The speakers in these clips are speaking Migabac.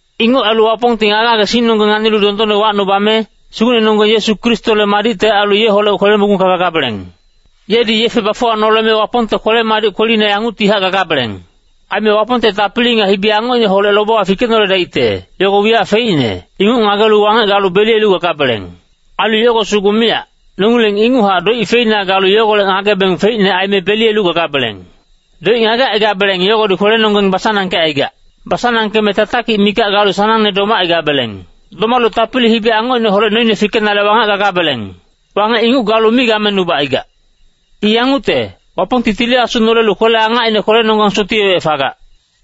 Inguc ailu Wapongti ngage-ngagesingnonggeng nganilu dondonne wacnubame, Sugucnenonggeng Yesu Kristole madicte ailu yeholec kwele-mogungka gagabeleng. Yedi yefe bafuwanoleme Wapongte kwele-madic kwelina yanguctihac gagabeleng. Aime Wapongte tapili nga hibi-angocineholec lobewa fikenoledaicte, yogo wiyac feicne, inguc ngagelu wangec galu beliyelu gagabeleng. Ailu yogo sugu miyac, nongileng inguchac doic feina galu yogolec ngagebeng feicne aime beliyelu gagabeleng. Doic ngagecaigabeleng yogodi kwelenonggeng basanangkecaigac. Basanangkeme tatakic mikac galu sanangne domacaigabeleng. Domalu tapili hibi-angocineholec noine fikenale wangec gagabeleng. Wangec inguc galu mi gamenubacaigac. I yangucte, Wapongti Tili Asu nolelu kwele-angacine kwelenonggang sotiyewec fagac.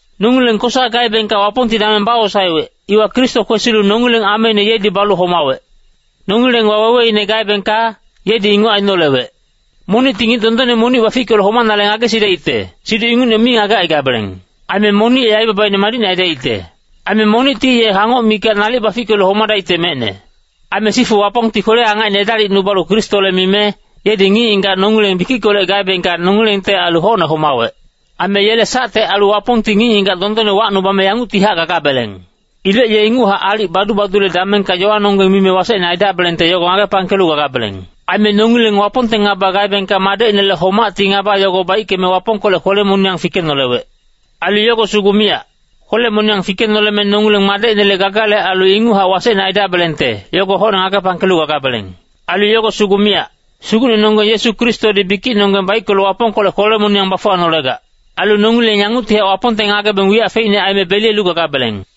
Nongileng kosa gaebengka Wapongti dameng bawosaewec, iwa Kristo kwesilu nongileng ameine yedi balu homawec. Nongileng waweweine gaebengka, yedi inguc ainolewec. Monicti ngic dondonne monic bafickelu homanale ngagesidaicte, siduc ingucne mi ngagecaigabeleng. Aime monic ye aibabaine madicne aidaicte. Aime monicti ye hangoc mikac nalic bafickelu homadaicte mecne. Aime sifu Wapongti kwele-angacine edalicnubalu Kristole mime, yedi ngic-ngigac nongileng bikickolec gaebengka nongilengte ailu hocne homawec. Aime yele sacte ailu Wapongti ngic-ngigac dondonne wacnubame yanguctihac gagabeleng. Ilec ye inguchac aalic badu-badule damengka yowanonggeng mime wasecne aidabelengte yogo ngagepangkelu gagabeleng. Aime nongileng Wapongte ngaba gaebengka Madecinele homacti ngaba yogo baickeme Wapongkolec kwele-moniyang fikenolewec. Ailu yogo sugu miyac. Kwele-moniyang fikenoleme nongileng Madecinele gagale ailu inguchac wasecne aidabelengte, yogo hocne ngagepangkelu gagabeleng. Ailu yogo sugu miyac. Sugucnenonggeng Yesu Kristodi bikicnonggeng baickelu Wapongkolec kwele-moniyang bafuwanolegac. Ailu nongileng yanguctihac Wapongte ngagebeng wiyac feicne aime beliyelu gagabeleng.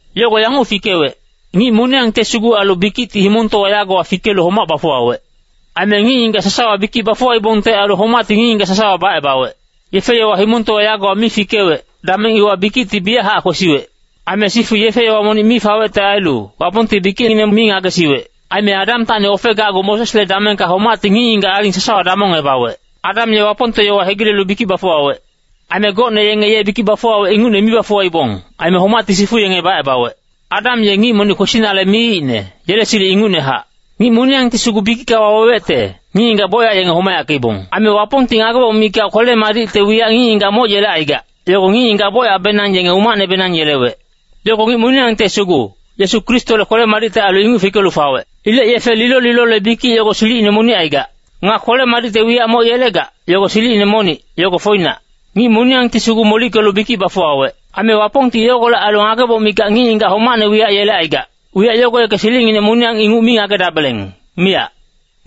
Yogo yanguc fikewec, ngic moniyangte sugu ailu bikicti himongtowa yagowa fikelu homac bafuwawec. Aime ngic-ngigac sasawa bikic bafuwaibongte ailu homacti ngic-ngigac sasawa bacebawec. Yefe-yowa himongtowa yagowa mi fikewec, dameng iwa bikicti biyachac kwesiwec. Aime sifu yefe-yowa monic mi fawecte ailu, Wapongti bikicngineng mi ngagesiwec. Aime Adamtacni ofegacgu Mosesle damengka homacti ngic-ngigac aling sasawa damongebawec. Adam ye Wapongte yowa hegilelu bikic bafuwawec. Aime gocne yenge ye bikic bafuwawec ingucne mi bafuwaibong, aime homacti sifu yenge bacebawec. Adam ye ngic monic kwesinale miicne, yele silic ingucnehac. Ngic moniyangti sugu bikicka wawewecte, ngic-ngigac bocyac yenge homayackeibong. Aime Wapongti ngageboc mikac ailu kwele-madicte wiyac ngic-ngigac moc yelecaigac, yogo ngic-ngigac bocyacbenang yenge umacnebenang yelewec. Yogo ngic moniyangte sugu, Yesu Kristole kwele-madicte ailu inguc fikelu fawec. Ilec yefe lilo-lilole bikic yogo silicine monic aigac. Nga kwele-madicte wiyac moc yelegac, yogo silicine monic, yogo foinac. Ngic moniyangti sugu molickelu bikic bafuwawec. Aime Wapongti yogolec ailu ngageboc mikac ngic-ngigac homacne wiyac yelecaigac, wiyac yogo yeke silicnginec moniyang inguc mi ngagedabeleng, miyac.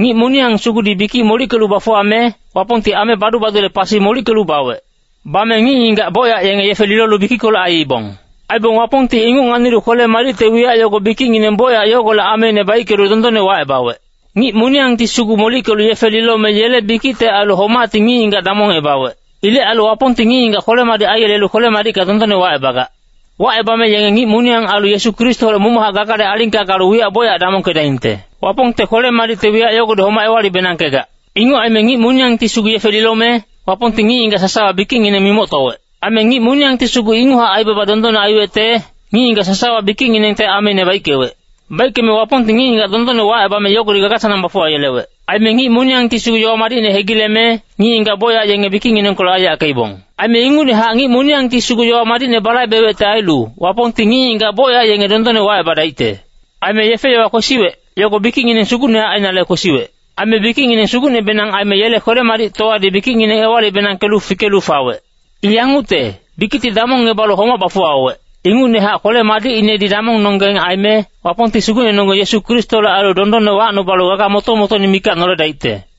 Ngic moniyang sugudi bikic molickelu bafuwame, Wapongti ame badu-badule pasi molickelu bawec. Bame ngic-ngigac bocyac yenge yefe lilolu bikickolec aiibong. Aibong Wapongti inguc nganilu kwele-madicte wiyac yogo bikicngineng bocyac yogolec ameine baickelu dondonne wacebawec. Ngic moniyangti sugu molickelu yefe lilome yele bikicte ailu homacti ngic-ngigac damongebawec. Ilec ailu Wapongti ngic-ngigac kwele-madic aiyelelu kwele-madicka dondonne wacebagac. Wacebame yenge ngic moniyang ailu Yesu Kristoholec momochac gagale alingka galu wiyac bocyac damongkedaingte. Wapongte kwele-madicte wiyac yogodi homac ewali-benangkegac. Inguc aime ngic moniyangti sugu yefe lilome, Wapongti ngic-ngigac sasawa bikicngineng mimoctowec. Aime ngic moniyangti sugu inguchac aibaba dondonne aiwecte, ngic-ngigac sasawa bikicnginengte ameine baickewec. Baickeme Wapongti ngic-ngigac dondonne wacebame yogodi gaga-sanang bafuwayelewec. Aime ngic moniyangti sugu yowa madicne hegileme, ngic-ngigac bocyac yenge bikicnginengkolec aiyackeibong. Aime ingucnehac ngic moniyangti sugu yowa madicne balaibewecte ailu, Wapongti ngic-ngigac bocyac yenge dondonne wacebadaicte. Aime yefe-yowa kwesiwec, yogo bikicngineng sugucnehac ainale kwesiwec. Aime bikicngineng sugucnebenang aime yele kwele-madictowadi bikicngineng ewali-benangkelu fikelu fawec. I yangucte, bikicti damongebalu homac bafuwawec, ingucnehac kwele-madicinedi damongnonggeng aime, Wapongti Sugucnenonggeng Yesu Kristole ailu dondonne wacnubalu gaga moto-motoine mikac noledaicte.